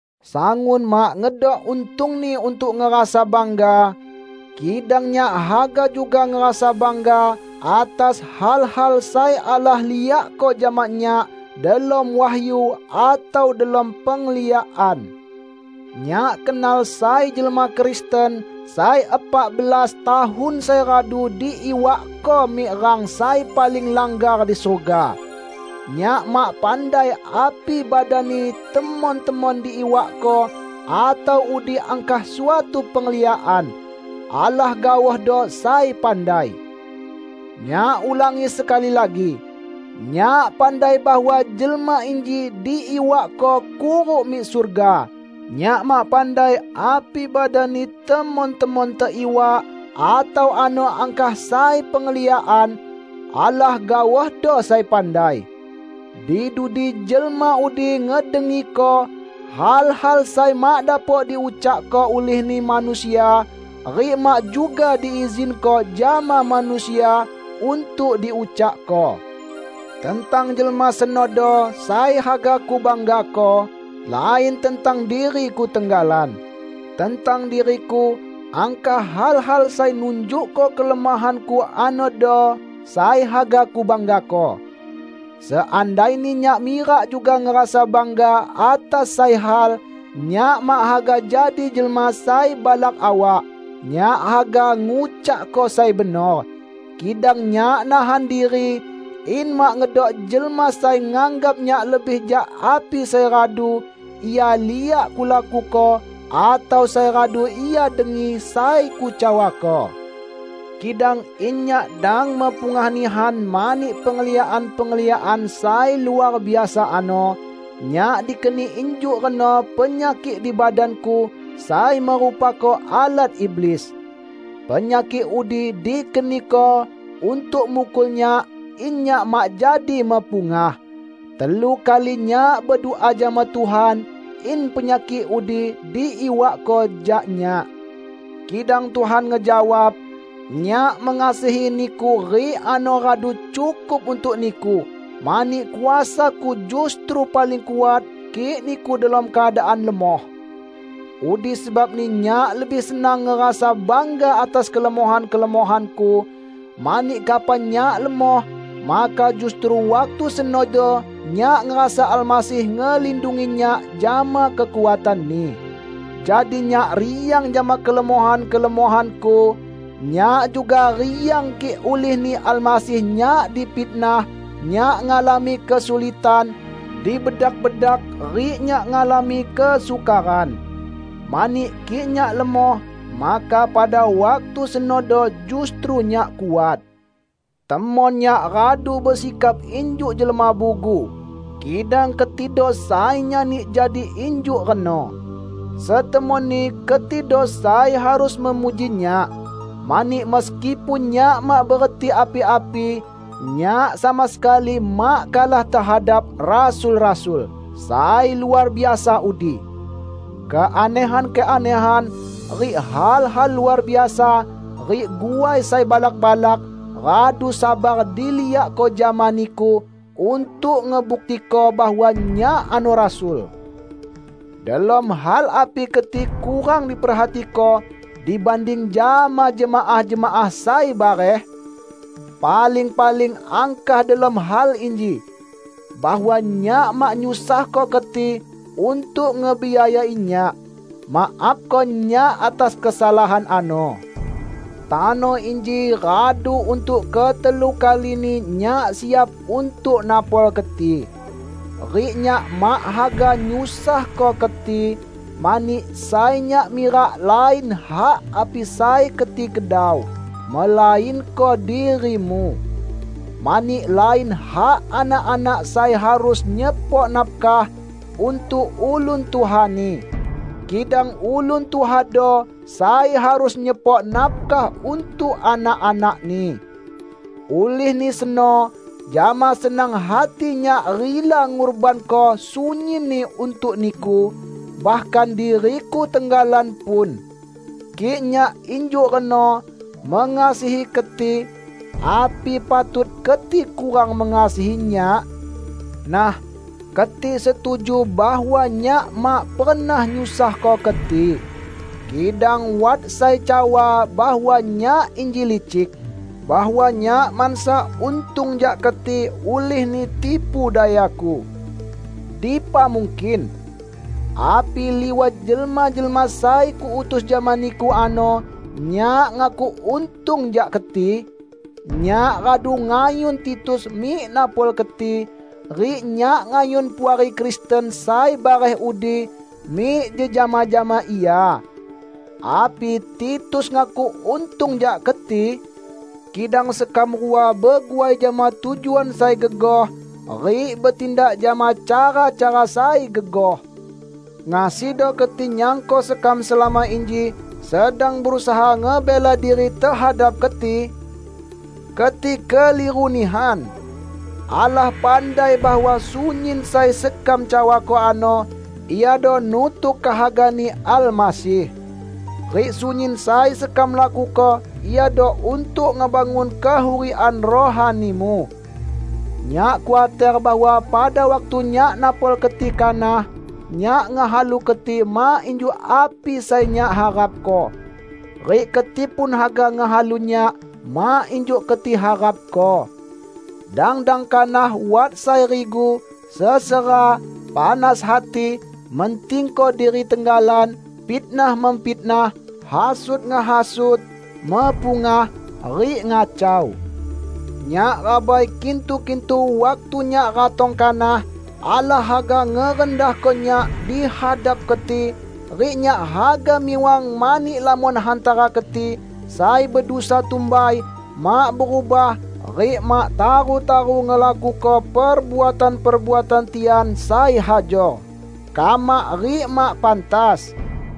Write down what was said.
Sangun mak ngedok untungni untuk ngerasa bangga. Kidang nyak haga juga ngerasa bangga atas hal-hal sai Allah liakko jama nyak delom wahyu atau delom pengliakan. Nyak kenal sai jelma Kristen sai epak belas tahun sai radu diiwakko mik rang sai paling langgar di surga. (Nyak mak pandai api badanni temon-temon diiwakko atau udi angkah suatu pengliakan -- Allah gaohdo sai pandai.) Nyak ulangi sekali lagi: Nyak pandai bahwa jelma inji diiwakko kuruk mik surga. (Nyak mak pandai api badanni temon-temon teiwak atau ano angkah sai pengliakan -- Allah gaohdo sai pandai.) Di dudi jelma udi ngedengiko hal-hal sai mak dapok diucakko ulihni manusia rik mak juga diizinko jama manusia untuk diucakko. Tentang jelma senodo sai haga kubanggako, lain tentang diriku tenggalan. Tentang diriku angkah hal-hal sai nunjukko kelemohanku anodo, sai haga kubanggako. Seandaini nyak mirak juga ngerasa bangga atas sai hal, nyak mak haga jadi jelma sai balak awak; nyak haga ngucakko sai benor. Kidang nyak nahan diri, in mak ngedok jelma sai nganggap nyak lebih jak api sai radu ia liak kulakuko atau sai radu ia dengi sai kucawako. Kidang in nyak dang mepungah nihan mani pengliakan-pengliakan sai luar biasa ano, nyak dikeni injuk reno penyakik di badanku sai merupako alat iblis. Penyakik udi dikeniko untuk mukul nyak in nyak mak jadi mepungah. Telu kali nyak bedua jama Tuhan in penyakik udi diiwakko jak nyak. Kidang Tuhan ngejawab, "Nyak mengasihi niku rik ano radu cukup untuk niku; mani kuasa-Ku justru paling kuat kik niku delom keadaan lemoh." Udi sebabni nyak lebih senang ngerasa bangga atas kelemohan-kelemohanku, mani kapan nyak lemoh, maka justru waktu senodo nyak ngerasa Almasih ngelindungi nyak jama kekuatan-Ni. Jadi nyak riang jama kelemohan-kelemohanku. Nyak juga riang kik ulih-Ni Almasih nyak difitnah, nyak ngalami kesulitan, dibedak-bedak rik nyak ngalami kesukaran. Mani kik nyak lemoh, maka pada waktu senodo justru nyak kuat. Temon nyak radu besikap injuk jelma bugu -- kidang ketido sai nyani jadi injuk reno. Setemonni ketido sai harus memuji nyak. Mani meskipun nyak mak bereti api-api, nyak sama sekali mak kalah tehadap "rasul-rasul" sai luar biasa udi! Keanehan-keanehan rik hal-hal luar biasa rik guai sai balak-balak radu sabar diliakko jama niku untuk ngebuktiko bahwa nyak ano rasul. Delom hal api keti kurang diperhatiko dibanding jama jemaah-jemaah sai bareh? Paling-paling angkah delom hal inji: bahwa nyak mak nyusahko keti untuk ngebiayai nyak. Maafko nyak atas kesalahan ano. Tano inji radu untuk ketelu kalini nyak siap untuk napol keti. Rik nyak mak haga nyusahko keti, mani sai nyak mirak lain hak api sai keti kedau, melainko dirimu. Mani lain hak anak-anak sai harus nyepok nafkah untuk ulun tuhani, kidang ulun tuhado sai harus nyepok nafkah untuk anak-anakni. Ulihni seno jama senang hati nyak rila ngurbanko sunyinni untuk niku, bahkan diriku tenggalan pun. Kik nyak injuk reno mengasihi keti, api patut keti kurang mengasihi nyak? Nah, keti setuju bahwa nyak mak pernah nyusahko keti. Kidang wat sai cawa bahwa nyak inji licik; bahwa nyak mansa untung jak keti ulihni tipu dayaku. Dipa mungkin! Api liwat jelma-jelma sai kuutus jama niku ano nyak ngakuk untung jak keti? Nyak radu ngayun Titus mik napol keti, rik nyak ngayun puari Kristen sai bareh udi mik jejama jama ia. Api Titus ngakuk untung jak keti? Kidang sekam rua beguai jama tujuan sai gegoh rik betindak jama cara-cara sai gegoh! Ngasido keti nyangko sekam selama inji sedang berusaha ngebela diri tehadap keti? Keti keliru nihan! Allah pandai bahwa sunyin sai sekam cawako ano iado nutuk kehaga-Ni Almasih. Rik sunyin sai sekam lakuko iado untuk ngebangun kehurikan rohanimu. Nyak khuater bahwa pada waktu nyak napol keti kanah, nyak ngehalu keti mak injuk api sai nyak harapko, rik keti pun haga ngehalu nyak mak injuk keti harapko. Dang-dang kanah wat sai rigu, sesera, panas hati, mentingko diri tenggalan, fitnah-memfitnah, hasut-ngehasut, mepungah, rik ngacau. Nyak rabai kintu-kintu waktu nyak ratong kanah Allah haga ngerendahko nyak di hadap keti rik nyak haga miwang mani lamon hantara keti sai bedusa tumbai, mak berubah rik mak taru-taru ngelakuko perbuatan-perbuatan tian sai hajor, kamak rik mak pantas.